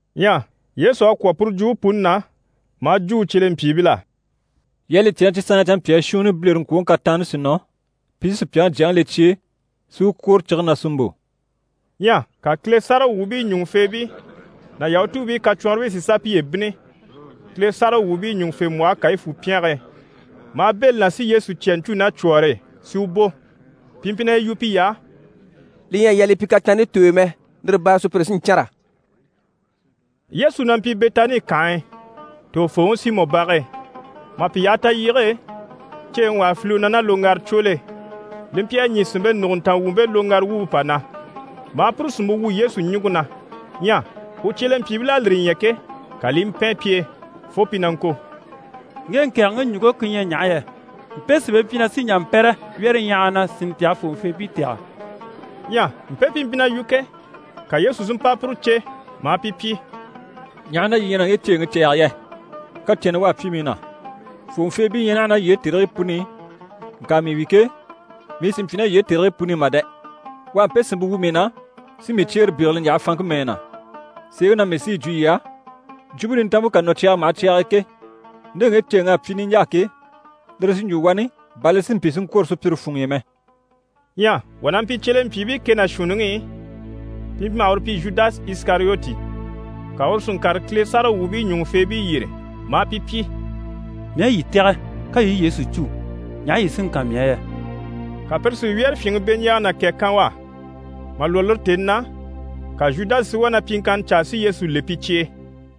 Ɲyɛ Yesu à kwɔ̀ puru jwumpe puni na, maa jwo u cyelempyiibil'á: «Yii à li cè na cyi sanŋkii ɲyɛ canmpyaa shuunni bilereŋkwoŋi kataanni sí nɔ, pi sí Supyaŋi Jyaŋi le cye e, si u kwòro cige na si mbò.» Ɲyɛ ka Kile sáragawwuubii ɲùŋufeebii ná Yahutuubii kacwɔnribii si sà piye bínni Kile sáragawwuubii ɲùŋufembwɔhe Kayifu pyɛnge e, maa bɛ̂ li na si Yesu cya ɲcû ná cwɔ̀ɔre e, si u bò. Pi mpyi na yi yu piy'á: «Li ɲyɛ a yaa li pyi kataanni tooy'e mɛ, lire baare e sùpyire sí n‑cânra.» Yesu na mpyi Bɛtani kànhe e tògofooŋi Simɔ bage e. Mà pi yaha talyige e, ceeŋi wà à file u na ná loŋgaracwol'e, li mpyi a ɲî sìnmpe nùguntanga wumpe loŋgara wumpe pà na, maa puru sìnmpe wu Yesu ɲùŋke na. Ɲyɛ u cyelempyiibil'à lire ɲya ke, ka li i mpɛn pi e fo pi na ŋko: «Ŋge ŋkɛ̀ɛgɛŋi ɲùŋke ku ɲyɛ ɲaha yɛ? Mpe sìnmpe mpyi na sí n‑jà n‑pɛ́rɛ wyɛ́rɛɲyahaga na, si ntaha fòŋɔfeebii tɛ̀gɛ.» Ɲyɛ mpe pi mpyi na yu ke, ka Yesu si mpa puru cè, maa pi pyi: «Ɲaha na yii ɲyɛ na ŋge ceeŋi cɛ̂ɛge yɛ? Kacɛnnɛ u à pyi mii na. Fòŋɔfeebii ɲyɛ naha ná yii e tèrigii puni i, ŋka mii wi ke, mii sì n‑pyi ná yii e tèrigii puni i mà dɛ! U à mpe sìnmpe wu mii na, si mii cyeere bégele ɲjaha fanŋke mɛɛ na. Sèeŋi na mii sí yi jwo yii á, Jwumpe Nintanmpe ká nɔ cyaga maha cyag'e ke, nde ŋge ceeŋ'à pyi niɲjaa ke, lire sí n‑jwo wani bà li si mpyi si ŋkwôro sùpyire funŋ'i mɛ.» Ɲyɛ wà na mpyi cyelempyiibii kɛ ná shuunniŋi i, pi mpyi maha uru pyi Zhudasi Isikariyoti, ka uru si ŋkàre Kile sáragawwuubii ɲùŋufeebii yyére, maa pi pyi: «Mii aha yii tɛ̀gɛ, ka yii i Yesu cû, ɲaha yii sí n‑kan mii á yɛ?» Ka pire si wyɛ́rɛfyinŋi beɲjaaga ná kɛ kan u á. Mà lwɔ́ lire tèni na, ka Zhudasi si wá na pyiŋkanna caa si Yesu le pi cye e.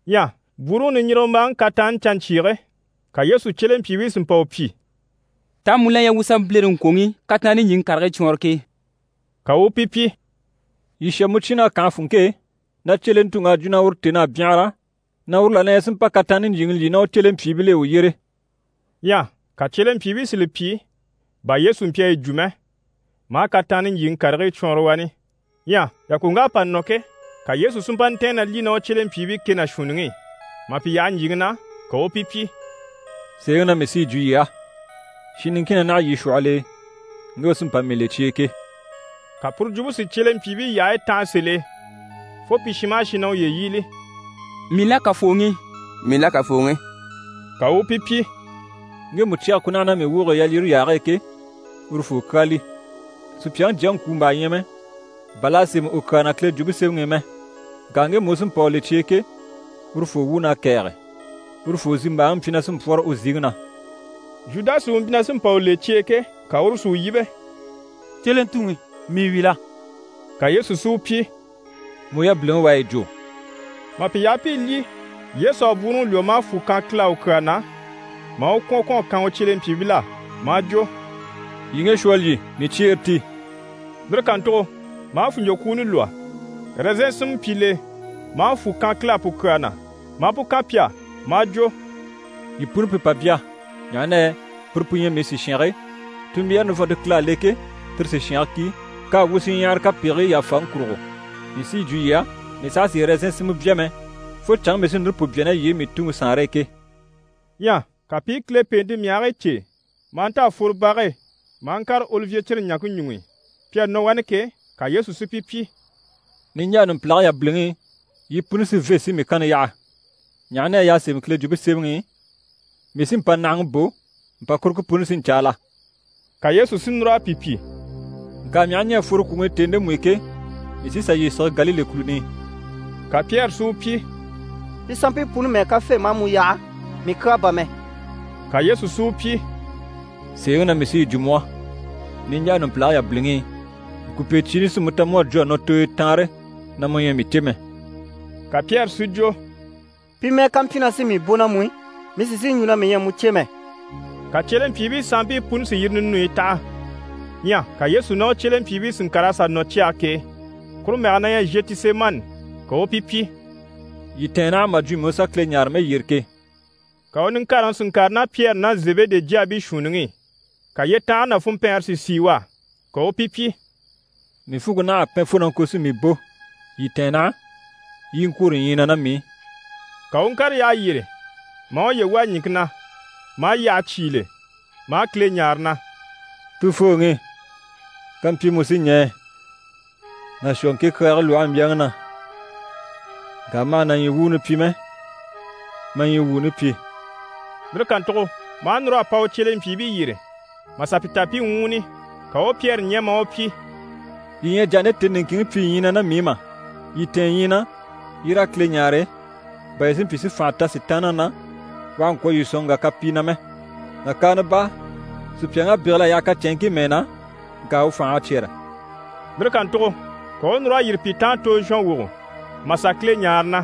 Ɲyɛ bwúuruŋi niɲjirigembaaŋi kataanni canɲcyiige, ka Yesu cyelempyiibii si mpa u pyi: «Taa mu la ɲyɛ wuu u sà bilereŋkwoŋi kataanni ɲjyìŋi karigii cwɔɔnrɔ ke?» Ka u u pi pyi: «Yii shà mucyinn'á kànhe funŋke e, na cyelentuŋ'à jwo na uru tèn'à byanhara, na uru la ɲyɛ si mpa kataanni ɲjyìŋi lyî ná u cyelempyiibil'e u yyére.» Ɲyɛ ka cyelempyiibii si li pyi bà Yesu mpyi a yi jwo mɛ, maa kataanni ɲjyìŋi karigii cwɔɔnrɔ wani. Ɲyɛ yàkoŋk'à pa nɔ ke, ka Yesu si mpa ntɛ̀ɛn na lyî ná u cyelempyiibii kɛ ná shuunniŋi i. Mà pi yaha ɲjyìŋi na, ka u u pi pyi: «Sèeŋi na mii sí yi jwo yii á, shin niŋkin na naha yii shwɔhɔl'e, ŋge u sí n‑pa mii le cye e ke.» Ka puru jwumpe si cyelempyiibii yyahayi tanha sèl'e fo pi shin maha shin na u yíbili: «Mii la, Kafooŋi?» «Mii la, Kafooŋi?» Ka u u pi pyi: «Ŋgemu cyɛge ku naha ná mii woge e yalyire yaage e ke, urufoo kyaa li. Supyaŋi Jyaŋi ŋkwùmbaa ɲyɛ mɛ, bà l'à sémɛ u kyaa na Kile Jwumpe Semɛŋi i mɛ. Ŋka ŋgemu u sí n‑pa u le cye e ke, urufoo wuun'à kɛ̀ɛge! Urufoo zimbaaŋi mpyi na sí n‑pwɔ́rɔ u ziŋi na.» Zhudasi u mpyi na sí n‑pa u le cye e ke, ka uru si u yíbe: «Cyelentuŋi, mii wi la?» Ka Yesu si u pyi: «Mu yabiliŋi u à yi jwo!» Mà pi yaha pi i lyî, Yesu à bwúuruŋi lwɔ́, maa fwù kan Kile á u kyaa na, maa u kwɔ̀n kwɔ̀n a kan u cyelempyiibil'á maa jwo: «Yii ŋge shwɔ a lyî, mii cyeere ti.» Lire kàntugo maa fùnɲcwokwuuni lwɔ́, ɛrɛzɛn sinmɛ mpyi l'e, maa fwù kan Kile á pu kyaa na, maa pu kan pi á maa jwo: «Yii puni pi pà bya. Ɲaha na yɛ puru pu ɲyɛ mii sìshange, tunmbyaare nivɔnnte Kile à le ke, tire sìshange ki, k'à wu shinɲyahara kapegigii yàfaŋi kurugo. Mii sí yi jwo yii á, mii saha sì ɛrɛzɛn sinmɛ bya mɛ, fo canŋke mii sí núru pu bya ná yii e mii Tuŋi Saanre e ke.» Ɲyɛ ka pi i Kile pèente myahigii cêe maa nta a fworo bage e, maa ŋkàre Olivye cire ɲaŋke ɲuŋ'i. Pi à nɔ wani ke, ka Yesu si pi pyi: «Niɲjaa numpilage yabiliŋi i, yii puni sí n‑fê si mii kanni yaha, ɲaha na yɛ y'à sémɛ Kile Jwumpe Semɛŋi i: “Mii sí mpànahaŋi bò, mpàkuruŋke puni sí n‑caala.”» Ka Yesu si núr'a pi pyi: «Ŋka mii aha ɲɛ̀ a fworo kwùŋi i tèni ndemu i ke, mii sí n‑sà yii sige Galile kùluni i.» Ka Pyɛri si u pyi: «Pi sanmpii puni mɛ́ɛ ká fê, maa mu yaha, mii kyaa bà mɛ!» Ka Yesu si u pyi: «Sèeŋi na mii sí yi jwo mu á, niɲjaa numpilage yabiliŋi i, ŋkùpecyiini sí mu ta mu à jwo a nɔ tooyo taanre na mu ɲyɛ a mii cè mɛ.» Ka Pyɛri si jwo: «Pi mɛ́ɛ ká mpyi na sí mii bò ná mu i, mii sì n‑sìi n‑jwo na mii ɲyɛ a mu cè mɛ.» Ka cyelempyiibii sanmpii puni si yire ninuyi taha. Ɲyɛ ka Yesu ná u cyelempyiibii si ŋkàr'a sà nɔ cyage k'e, kuru mɛge na ɲyɛ Zhetisemani, ka u u pi pyi: «Yii tɛ̀ɛn naha mà jwo mii u sà Kile ɲáare mɛyyere ke.» Ka u niŋkareŋi si ŋkàre ná Pyɛri ná Zebede jyaabii shuunniŋi i. Ka yyetanhare ná funmpɛɛnre si sìi u á. Ka u u pi pyi: «Mii funŋke naha a pɛn fo na ŋko si mii bò. Yii tɛ̀ɛn naha, yii i ŋkwôro ɲyii na ná mii i.» Ka u u ŋkàre yyaha yyére, maa uye wà ɲìŋke na, maa yyaha cyígile, maa Kile ɲáare na: «Tufooŋi, kampyi mu sí ɲɛɛ, na shwɔ ŋke kyaage lwɔhe mbyaŋi na. Ŋka ma hà na ɲyii wuuni pyi mɛ, ma ɲyii wuuni pyi.» Lire kàntugo maa núr'a pa u cyelempyiibii yyére, mà sà pi ta pi i ŋwúuni. Ka u u Pyɛri ɲɛ̀, maa u pyi: «Yii ɲyɛ a jà a nde tèni niŋkinŋi pyi ɲyii na ná mii i mà? Yii tɛ̀ɛn ɲyii na, yii raa Kile ɲáare, bà yii si mpyi si fànha ta Sitaanniŋi na, u àha ŋkwɔ̀ yii sɔ̀n ŋgà kapii na mɛ. Nàkaana baa, sùpyaŋ'à bégel'a yaha kacɛnŋkii mɛɛ na, ŋka u fành'à cyɛ́rɛ.» Lire kàntugo ka u u núr'a yîri pi taan tozhɔnwogo mà sà Kile ɲáare na: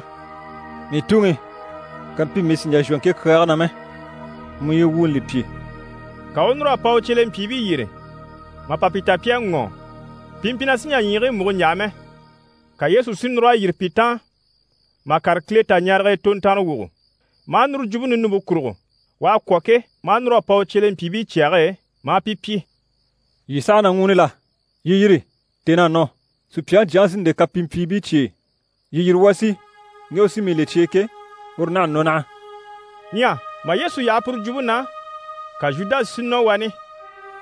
«Mii Tuŋi, kampyi mii sì n‑jà n‑shwɔ ŋke kyaage na mɛ, mu ɲyii wuuni li pyi.» Ka u u núr'a pa u cyelempyiibii yyére mà pa pi ta pi à ŋɔ́ɔ, pi mpyi na sì n‑jà ɲyiigii múgo n‑yaha mɛ. Ka Yesu si núr'a yîri pi taan mà kàre Kile taɲarege e tontanrewogo, maa núru jwumpe ninumpe kurugo. U à kwɔ̀ ke, maa núr'a pa u cyelempyiibii cyage e maa pi pyi: «Yii saha na ŋwúuni la? Yii yîri, tèn'à nɔ, Supyaŋi Jyaŋi sí n‑le kapimpyiibii cye e. Yii yîri, wuu a sì, ŋge u sí mii le cye e ke, uru naha a nɔ naha.» Ɲyɛ mà Yesu yaha puru jwumpe na, ka Zhudasi si nɔ wani,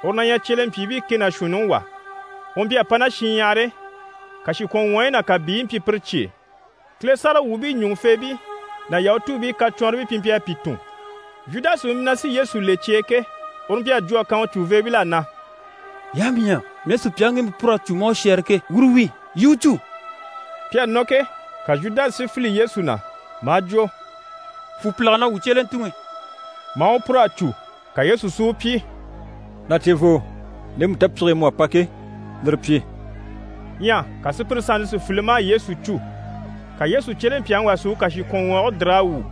uru na ɲyɛ cyelempyiibii kɛ ná shuunniŋi wà. U mpyi a pa ná shinɲyahar'e, kàshikwɔnŋwɔɔyi ná kàbiiyi mpyi pire cye e. Kile sáragawwuubii ɲùŋufeebii ná Yahutuubii kacwɔnribii pi mpyi a pi tun. Zhudasi u mpyi na sí Yesu le cye e ke, uru mpyi a jwo a kan u cùveebil'á na: «Yii aha mii ɲya mii à sùpyaŋi ŋgemu pûr'a cû maa u shɛ́ɛre ke, uru wi. Yii i u cû.» Pi à nɔ ke, ka Zhudasi si file Yesu na, maa jwo: «Fwù pìlaga na, wuu cyelentuŋi» maa u pûr'a cû. Ka Yesu si u pyi: «Na cevoo, ndemu tapyige e mu à pa ke, lire pyi.» Ɲyɛ ka sùpyire sannte si file maa Yesu cû. Ka Yesu cyelempyaŋi wà si u kàshikwɔnŋwɔɔge dìr'a wwû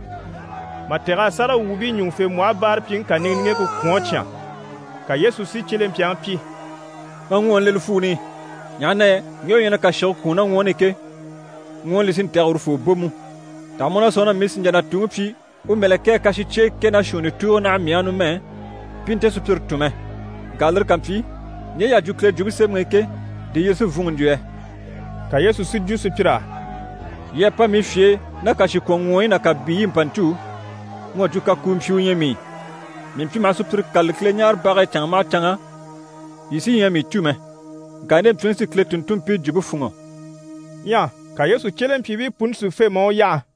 mà taha a sáragawwuubii ɲùŋufembwɔhe báarapyiŋi niŋgeŋke kà kwɔ̀n a cyán. Ka Yesu si cyelempyaŋi pyi: «Ma ŋwɔɔni le li fwuuni i, ɲaha na yɛ ŋgemu u ɲyɛ na kàshige kwùun ná ŋwɔɔni i ke, ŋwɔɔni li sí n‑tɛ̀gɛ urufoo bò mú. Taha mu na sɔ̂nŋi na mii sì n‑jà na Tuŋi pyi u mɛ̀lɛkɛɛ kàshicyeye kɛ ná shuunni tùugo naha mii á numɛ, pi i nte sùpyire tun mɛ? Ŋka lire ká mpyi, ɲje y'à jwo Kile Jwumpe Semɛŋi i ke, di yire sí n‑fûnŋɔ n‑jwo yɛ?» Ka Yesu si jwo sùpyir'á: «Yii à pa mii fye e ná kàshikwɔnŋwɔɔyi ná kàbiiyi i mpa ɲcû, mu à jwo kakuumpyi u ɲyɛ mii. Mii mpyi maha sùpyire kâlali Kileɲaarebage e canŋa maha canŋa, yii sí ɲyɛ a mii cû mɛ. Ŋka nde mpyiŋi sí Kile tùnntunmpii jwumpe fûnŋɔ.» Ɲyɛ ka Yesu cyelempyiibii puni si fê, maa u yaha.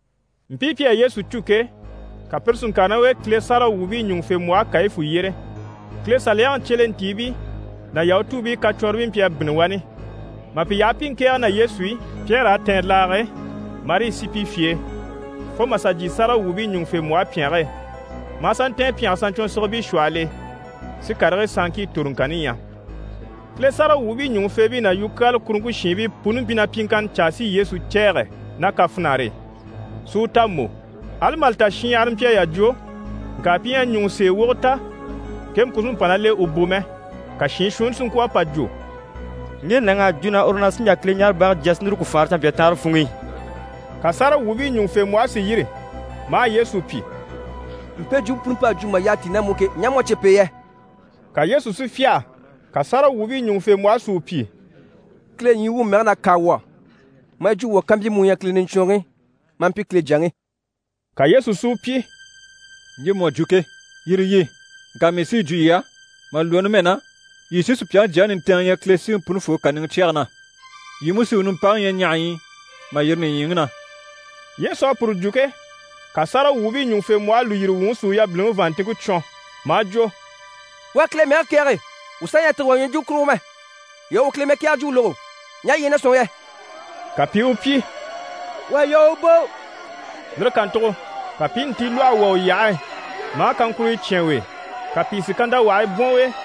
Mpii pi à Yesu cû ke, ka pire si ŋkàre ná u e Kile sáragawwuubii ɲùŋufembwɔhe Kayifu yyére. Kile Saliyaŋi cyelentiibii ná Yahutuubii kacwɔnribii mpyi a bínni wani. Mà pi yaha pi i ŋkɛ̀ɛge ná Yesu i, Pyɛri à tɛ̀ɛn laage e, marii sì pi fye e fo mà sà jyè sáragawwuubii ɲùŋufembwɔhe pyɛnge e, maa sà ntɛ̀ɛn pyɛnge saɲcwɔnsigibii shwɔhɔl'e, si karigii sanŋkii toroŋkanni ɲya. Kile sáragawwuubii ɲùŋufeebii ná yukyaala kuruŋke shiinbii puni mpyi na pyiŋkanna caa si Yesu cɛ̂ɛgɛ ná kafinare e, si u ta mbò. Ali mà li ta shinɲyahara mpyi a yà jwo, ŋka pi ɲyɛ a ɲùŋɔ sèe wogo ta ŋkemu ku sí mpa ná l'e u bò mɛ. Ka shiin shuunni si ŋkwɔ̀ a pa jwo: «Ŋge nàŋ'à jwo na uru sí n‑jà Kileɲaarebage jya, si núru ku faanra canmpyaa taanre funŋ'i.» Ka sáragawwuubii ɲùŋufembwɔhe si yîri maa Yesu pyi: «Mpe jwumpe puni p'à jwo mà yyaha tíi ná mu i ke, ɲaha mu u à cè p'e yɛ?» Ka Yesu si fyâha. Ka sáragawwuubii ɲùŋufembwɔhe si u pyi: «Kile ɲyii wuŋi mɛge na, kâa wuu á, maa yi jwo wuu á kampyi mu u ɲyɛ Kile Niɲcwɔnrɔŋi, maa mpyi Kile Jyaŋi?» Ka Yesu si u pyi: «Ɲje mu à jwo ke, yire yi. Ŋka mii sí yi jwo yii á, mà lwɔ́ numɛ na, yii sí Supyaŋi Jyaŋi nintɛɛnŋi ɲya Kile Siŋi Punifoo kàniŋɛ cyɛge na. Yii mú sí u nimpaŋi ɲya ɲahaɲyi i mà yîri nìɲyiŋi na.» Yesu à puru jwo ke, ka sáragawwuubii ɲùŋufembwɔhe lùyiri wuŋi si u yabiliŋi vàanntinŋke cwɔn, maa jwo: «U à Kile mɛge kɛ̀ɛge, wuu saha ɲyɛ a tîge wà ɲwɔjwumɔ kurugo mɛ. Yii à u Kile mɛkɛɛgɛ jwumpe lógo. Ɲaha yii ɲyɛ na sɔ̂nŋi yɛ?» Ka pi i u pyi: «U à yaa u bò.» Lire kàntugo ka pi i ntilwɔhe wà u yyahe e, maa kaŋkuruyo cyán u e, ka pìi si kantawahii bwɔ̀n u e,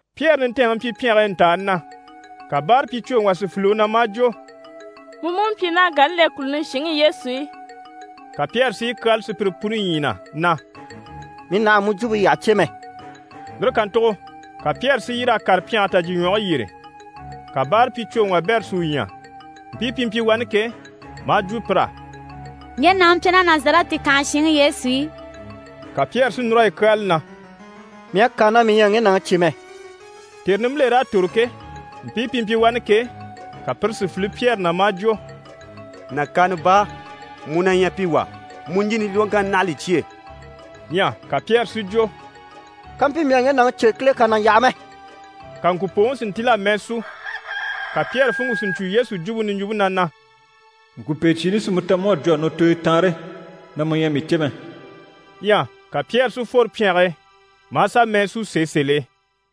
Pyɛri nintɛɛnŋi mpyi pyɛnge e ntàani na, ka báarapyicwoŋi wà si file u na maa jwo: «Mu mú mpyi ná Galile kùluni shinŋi Yesu e!» Ka Pyɛri si yi kyáala sùpyire puni ɲyii na, na: «Mii nàha à mu jwumpe yyaha cè mɛ.» Lire kàntugo ka Pyɛri si yîr'a kàre pyɛnge tajyiɲwɔge yyére. Ka báarapyicwoŋi wabɛrɛ si u ɲya, mpii pi mpyi wani ke, maa jwo pir'á: «Ŋge nàŋi mpyi ná Nazarɛti kànhe shinŋi Yesu e.» Ka Pyɛri si núr'a yi kyáala na: «Mii à kâa na mii ɲyɛ a ŋge nàŋi cè mɛ!» Tère nimbiler'à tòro ke, mpii pi mpyi wani ke, ka pire si file Pyɛri na, maa jwo: «Nàkaana baa, mu na ɲyɛ pi wà, mu ɲjini lwɔ́ŋkanni naha a li cyêe.» Ɲyɛ ka Pyɛri si jwo: «Kampyi mii à ŋge nàŋi cè, Kile kà na yaha mɛ!» Ka ŋkùpooŋi si ntíl'a mɛɛ sú. Ka Pyɛri funŋke si ɲcwo Yesu jwumpe niɲjwumpe na na: «Ŋkùpecyiini sí mu ta mu à jwo a nɔ tooyo taanre na mu ɲyɛ a mii cè mɛ.» Ɲyɛ ka Pyɛri si fworo pyɛnge e maa sà mɛɛ sú sèe sèl'e.